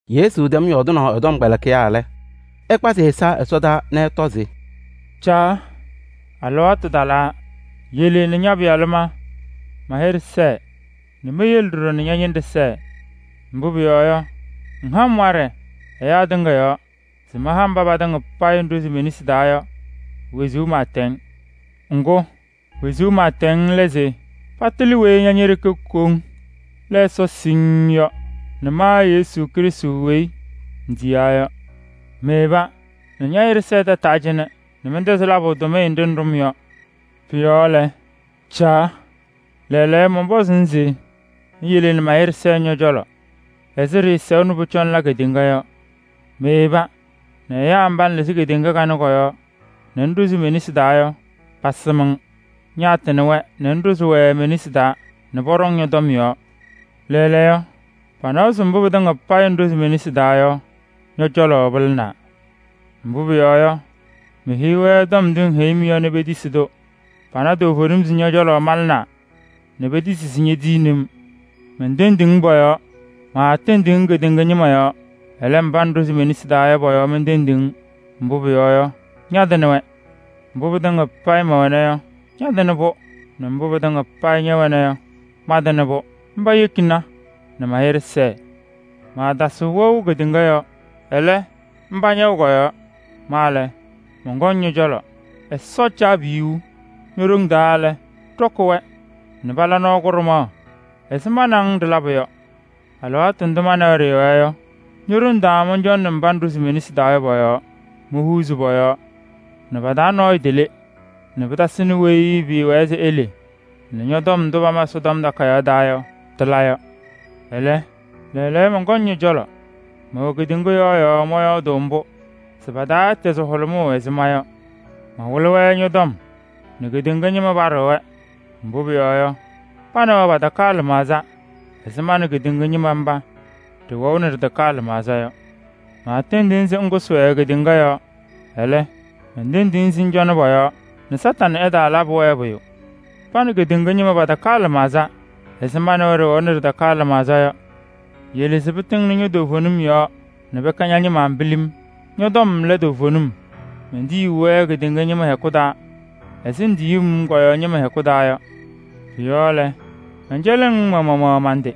Yesu tɛm yɔɔdɩnaʋ ɛ-tɔmkpɛlɩkɩyaa lɛ, ɛkpazɩ ɛza ɛsɔdaa nɛ ɛtɔ se: “Caa! Alɩwaatʋ talaa. Yele nɛ ña-Pɩyalʋ ma, ma-hɩɖɛ sɛɛ nɛ meyele ɖɔɖɔ ña-ñɩnɖɛ sɛɛ. Mbʋ pʋyɔɔ yɔ, ŋha-m waɖɛ ɛyaa tɩŋa yɔɔ se maha mba patɩŋa payɩ ŋɖʋzɩ me-nesi taa yɔ wezuu pɩɩtɛŋ. Ŋgʋ, wezuu pɩɩtɛŋ lɛ se patɩlɩ weyi ña ñe-ɖeke koŋ lɛ Ɛsɔ siŋŋ yɔ nɛ ma Yesu Krɩstʋ weyi ŋtiyaa yɔ. Meyeba nɛ ña-hɩɖɛ sɛɛ tataa cɩnɛ nɛ mɛntɛzɩ labʋ tʋmɩyɛ nɖɩ ŋɖʋ-m yɔ. Pʋ-yɔɔ lɛ, Caa! Lɛɛlɛɛyɔ, mɔnpɔzʋʋ-ŋ se ŋyele nɛ ma-hɩɖɛ sɛɛ ñɔ-cɔlɔ ɛzɩ ɖɩɩsɛʋ nɛ pʋcɔ ŋla kedeŋa yɔ. Meyeba nɛ ɛyaa mba ŋlɩzɩ kedeŋa kanɛ kɔ-yɔɔ nɛ ŋɖʋzɩ me-nesi taa yɔ, pasɩm-ŋ. Ñaatɩnɩ-wɛ nɛ ŋɖʋzɩ-wɛ me-nesi taa nɛ pɔɖɔŋ ñɔ-tɔm yɔɔ. Lɛɛlɛɛyɔ, panawa se mbʋ pɩtɩŋa payɩ ŋɖʋzɩ me-nesi taa yɔ, ñɔ-cɔlɔ pɩlɩnaa. Mbʋ pʋyɔɔ yɔ, meheyi-wɛ tɔm ndʋ ŋheyi-m yɔ nɛ petisi-tʋ. Pana toovenim se ñɔ-cɔlɔ malɩnaa nɛ petisi se ñetiyini-m. Mentendiɣ-ŋ pɔ-yɔɔ. Maatendiɣ-ŋ kedeŋa ñɩma yɔɔ, ɛlɛ, mba ŋɖʋzɩ me-nesi taa yɔ, pɔ-yɔɔ mentendiɣ-ŋ. Mbʋ pʋyɔɔ yɔ, ñatɩnɩ-wɛ. Mbʋ pɩtɩŋa payɩ mɛwɛna yɔ, ñatɩnɩ-pʋ nɛ mbʋ pɩtɩŋa payɩ ña ñɛwɛna yɔ, mantɩnɩ-pʋ. Mba yekina nɛ ma-hɩɖɛ sɛɛ. Maatasɩɣ wɛʋ kedeŋa yɔɔ, ɛlɛ, mba ñɛwɛ kɔ-yɔɔ. Ma lɛ, mɔnkɔŋ ñɔ-cɔlɔ. Ɛsɔ Caabiyuu! Ño-ɖoŋ taa lɛ, ɖɔkɩ-wɛ nɛ pala nɔɔ kʋɖʋmaɣ ɛzɩ ma nɛ ŋ ɖɩlabʋ yɔ. Alɩwaatʋ ndʋ ma nɛ wɛ ɖɩɩwɛɛ yɔ, ño-ɖoŋ taa mɔncɔnɩ mba ŋɖʋzɩ me-nesi taa yɔ pɔ-yɔɔ: mohuuzi pɔ-yɔɔ nɛ pa-taa nɔɔyʋ tele nɛ pɩtasɩnɩ weyi pɩɩwɛɛ se ele nɛ tɔm ndʋ pama Ɛsɔtɔm Takayaɣ taa yɔ, tɩla yɔ. Ɛlɛ, lɛɛlɛɛyɔ mɔnkɔŋ ñɔ-cɔlɔ. Mɛwɛ kedeŋa yɔɔ yɔɔ mɔyɔɔdʋʋ mbʋ se pa-taa ɛtɛzɩ hʋlʋmʋʋ ɛzɩ ma yɔ. Mawɩlɩ-wɛ ñɔ-tɔm nɛ kedeŋa ñɩma paɖɩɣ-wɛ, mbʋ pʋyɔɔ yɔ, pa nɛ wɛ patakaa lɩmaɣza ɛzɩ ma nɛ kedeŋa ñɩma mba ɖɩwɛʋ nɛ ɖɩtakaa lɩmaɣza yɔ. Maatendiɣ-ŋ se ŋkʋsɩ-wɛ kedeŋa yɔɔ, ɛlɛ, mentendiɣ-ŋ se ŋcɔnɩ pɔ-yɔɔ nɛ Kañadʋ Satanɩ ɛtaalabɩ-wɛ pʋyʋ. Pa nɛ kedeŋa ñɩma patakaa lɩmaɣza ɛzɩ ma nɛ wɛ ɖɩwɛʋ nɛ ɖɩtakaa lɩmaɣza yɔ. Yele se pɩtɩŋnɩ toovenim yɔɔ nɛ pɛkɛ ña-ñɩma pilim. Ñɔ-tɔm lɛ toovenim. Mentiyi-wɛ kedeŋa yɔɔ ñɩma hɛkʋ taa ɛzɩ ŋtiyuu-m kɔ-yɔɔ ñɩma hɛkʋ taa yɔ. Pɔ-yɔɔ lɛ, mɛncɛlɩɣ-ŋ ma maɣmaɣ man-tɩ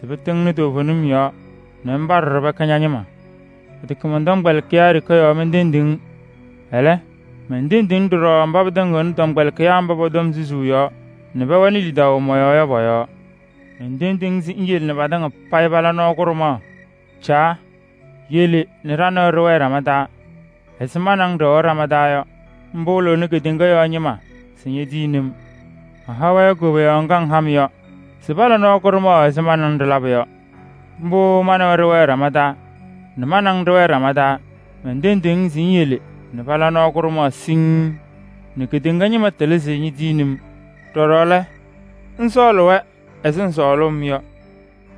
se pɩtɩŋnɩ toovenim yɔɔ nɛ mba ɖɔɖɔ pɛkɛ ña-ñɩma. Pɩtɛkɛ mɔn-tɔmkpɛlɩkɩyaa yɔɔ ɖeke mentendiɣ-ŋ. Ɛlɛ, mentendiɣ-ŋ ɖɔɖɔ mba pɩtɩŋɩɣnɩ tɔmkpɛlɩkɩyaa mba pɔ-tɔm susuu yɔɔ nɛ pɛwɛnɩ lidaʋ mɔ-yɔɔ yɔ pɔ-yɔɔ. Mentendiɣ-ŋ se ŋyele nɛ patɩŋa payɩ pala nɔɔ kʋɖʋmaɣ. Caa! Yele ɖa nɛ wɛ ɖɩwɛɛ ɖama taa ɛzɩ ma nɛ ŋ ɖɩwɛʋ ɖama taa yɔ. Mbʋ wɩlɩɣnɩ kedeŋa ñɩma se ñetiyini-m. Maha-wɛ koboyaɣ ŋga ŋha-m yɔ se pala nɔɔ kʋɖʋmaɣ ɛzɩ ma nɛ ŋ ɖɩlabʋ yɔ. Mbʋ ma nɛ wɛ ɖɩwɛ ɖama taa nɛ ma nɛ ŋ ɖɩwɛɛ ɖama taa. Mentendiɣ-ŋ se ŋyele nɛ pala nɔɔ kʋɖʋmaɣ siŋŋ nɛ kedeŋa ñɩma tɩlɩ se ñetiyini-m. Ɖɔɖɔ lɛ, ŋsɔɔlɩ-wɛ ɛzɩ ŋsɔɔlʋʋ-m yɔ.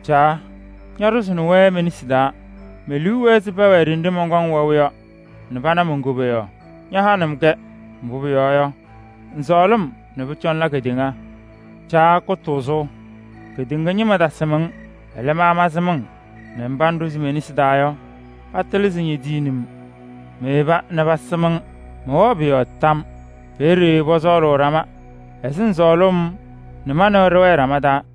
Caa! Ñaɖʋzɩnɩ-wɛ me-nesi taa. Me-liu wɛɛ se pɛwɛɛ ɖenɖe mɔnkɔŋ wɛʋ yɔ nɛ pana mon-koboyaɣ. Ñahanɩ-m-kɛ, mbʋ pʋyɔɔ yɔ, ŋŋsɔɔlɩ-m nɛ pʋcɔ ŋla kedeŋa. Caa kʋtʋʋzʋ! Keɖeŋa ñɩma tasɩm-ŋ. Ɛlɛ, ma mansɩm-ŋ nɛ mba ŋɖʋzɩ me-nesi taa yɔ, patɩlɩ se ñetiyini-m. Meyeba nɛ pasɩm-ŋ, mɛwɛɣ pʋ-yɔɔ tam. Peeye pɔsɔɔlʋʋ ɖama ɛzɩ ŋsɔɔlʋʋ-m yɔ nɛ ma nɛ wɛ ɖɩwɛɛ ɖama taa.”